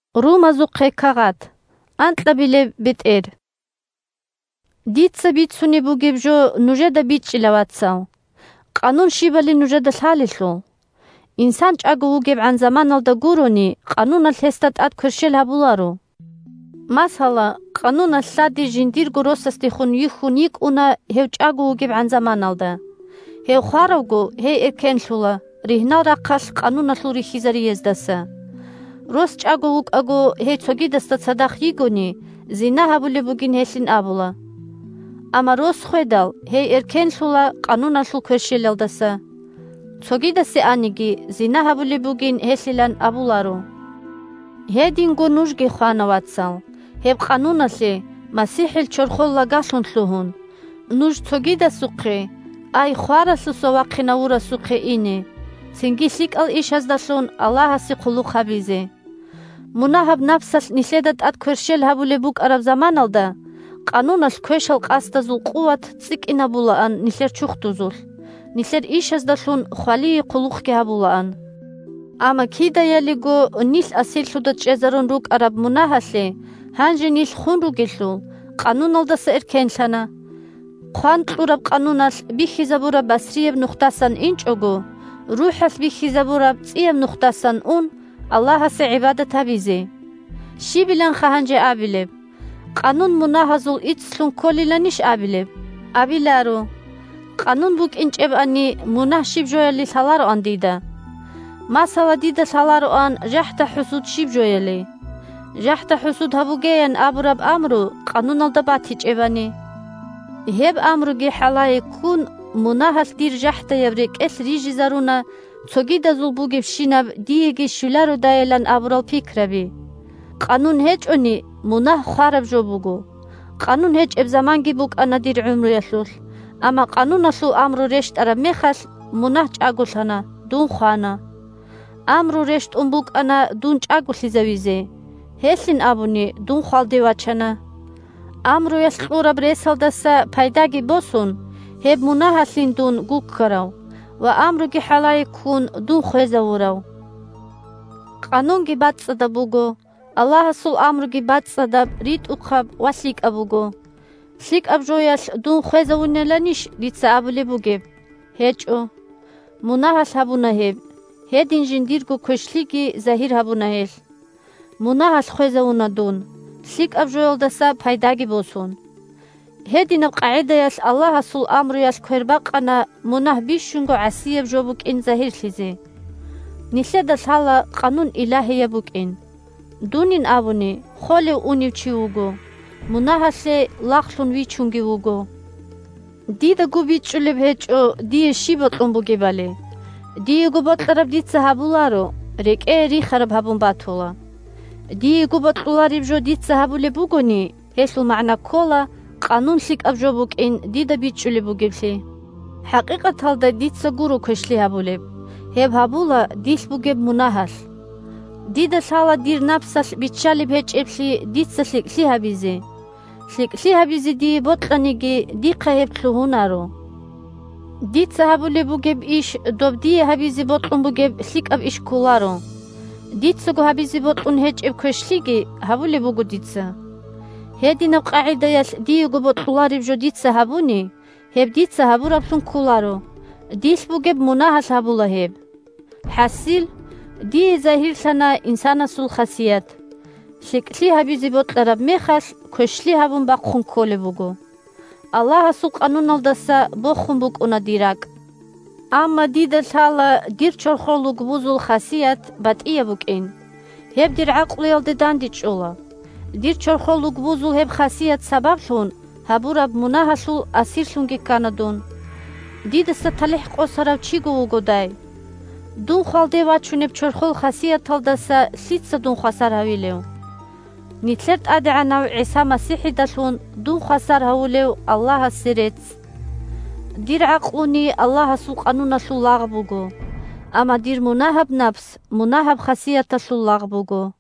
Къануналъе хвеялъул магӀна щиб? Дица бицунеб бугеб жо нужеда бичӀчӀила, вацал, Къанун щибали нужеда лъалелъул. Инсан чӀаго вугебгӀан заманалда гурони, Къануналъ гьесда тӀад кверщел гьабуларо. Масала, Къануналъ лъади жиндирго росасдехун юхьун йикӀуна гьев чӀаго вугебгӀан заманалда. Гьев хваравго, гьей эркенлъула ригьнал рахъалъ Къануналъул рихьизарияздаса. Рос чӀаго вукӀаго гьей цогидасда цадахъ йигони, зина гьабулеб бугин гьелъилан абула. Амма рос хведал гьей эркенлъула Къануналъул кверщелалдаса. Цогидасе аниги, зина гьабулеб бугин гьелъилан абуларо. Гьединго нужги хвана, вацал, гьеб Къануналъе, – МасихӀил чорхол лагалъун лъугьун, нуж цогидасухъе, ай хваралъуса вахъинавурасухъе, ине, цинги лъикӀал ишаздалъун Аллагьасе хъулухъ гьабизе. Мунагьаб напсалъ нилъеда тӀад кверщел гьабулеб букӀараб заманалда, Къануналъ квешал къасдазул къуват цӀикӀкӀинабулаан нилъер чурхдузулъ, нилъер ишаздалъун хвалие хъулухъги гьабулаан. Амма кидаялиго нилъ асирлъуда чӀезарун рукӀараб мунагьалъе гьанже нилъ хун ругелъул, Къануналдаса эркенлъана, – хъван кьураб Къануналъ бихьизабураб басрияб нухдасан инчӀого, РухӀалъ бихьизабураб цӀияб нухдасан ун, Аллагьасе гӀибадат гьабизе. Щибиланха гьанже абилеб? Къанун мунагьазул иццлъун кколиланищ абилеб? Абиларо! Къанун букӀинчӀебани, мунагь щиб жояли лъалароан дида. Масала, дида лъалароан, жахӀда-хӀусуд щиб жояли: «ЖахӀда-хӀусуд гьабуге!» – ян абураб амру Къануналда батичӀебани. Гьеб амруги хӀалае ккун, мунагьалъ дир жахӀдаяб рекӀелъ рижизаруна цогидазул бугебщинаб диеги щвелародайилан абурал пикраби. Къанун гьечӀони, мунагь хвараб жо буго. Къанун гьечӀеб заманги букӀана дир гӀумруялъулъ, амма Къануналъул амру рещтӀараб мехалъ, мунагь чӀаголъана, дун хвана. Амру рещтӀун букӀана дун чӀаголъизавизе, гьелъин абуни, дун хвалде вачана. Амруялъ кьураб ресалдаса пайдаги босун, гьеб мунагьалъин дун гуккарав ва, амруги хӀалае ккун, дун хвезавурав. Къанунги бацӀцӀадаб буго, Аллагьасул амруги бацӀцӀадаб, ритӀухъаб ва лъикӀаб буго. ЛъикӀаб жоялъ дун хвезавуниланищ дица абулеб бугеб? ГьечӀо! Мунагьалъ гьабуна гьеб, гьедин жиндирго квешлъиги загьир гьабуна гьелъ. Мунагьалъ хвезавуна дун, лъикӀаб жоялдаса пайдаги босун. Гьединаб къагӀидаялъ Аллагьасул амруялъ квербакъана мунагь бищунго гӀасияб жо букӀин загьирлъизе. Нилъеда лъала Къанун илагьияб букӀин, дунин абуни, холев-унев чи вуго, мунагьалъе лагълъун вичунги вуго. Дидаго бичӀчӀулеб гьечӀо дие щиб бокьун бугебали. Диего бокьараб дица гьабуларо, рекӀее рихараб гьабун батула. Диего бокьулареб жо дица гьабулеб бугони, гьелъул магӀна ккола Къанун лъикӀаб жо букӀин дида бичӀчӀулеб бугеблъи. ХӀакъикъаталда дица гуро квешлъи гьабулеб, гьеб гьабула дилъ бугеб мунагьалъ. Дида лъала дир напсалъ биччалеб гьечӀеблъи дица лъикӀлъи гьабизе: лъикӀлъи гьабизе дие бокьаниги, дихъа гьеб лъугьунаро. Дица гьабулеб бугеб иш доб дие гьабизе бокьун бугеб лъикӀаб иш кколаро. Дицаго гьабизе бокьун гьечӀеб квешлъиги гьабулеб буго дица. Гьединаб къагӀидаялъ диего бокьулареб жо дица гьабуни, гьеб дица гьабураблъун кколаро, дилъ бугеб мунагьалъ гьабула гьеб. ХӀасил, дие загьирлъана инсанасул хасият: лъикӀлъи гьабизе бокьараб мехалъ, квешлъи гьабун бахъун кколеб буго. Аллагьасул Къануналдаса бохун букӀуна дир ракӀ. Амма дида лъала дир чорхол лугбузул хасият батӀияб букӀин. Гьеб дир гӀакълуялда дандечӀола. Дир чорхол лугбузул гьеб хасият сабаблъун гьабураб мунагьалъул асирлъунги ккана дун. Дидаса талихӀ къосарав чиго вугодай! Дун хвалде вачунеб чорхол хасияталдаса лъица дун хвасар гьавилев? Нилъер ТӀадегӀанав ГӀиса МасихӀидалъун дун хвасар гьавулев Аллагьасе рецц! Дир гӀакълуни Аллагьасул Къануналъул лагъ буго. Амма дир мунагьаб напс мунагьаб хасияталъул лагъ буго.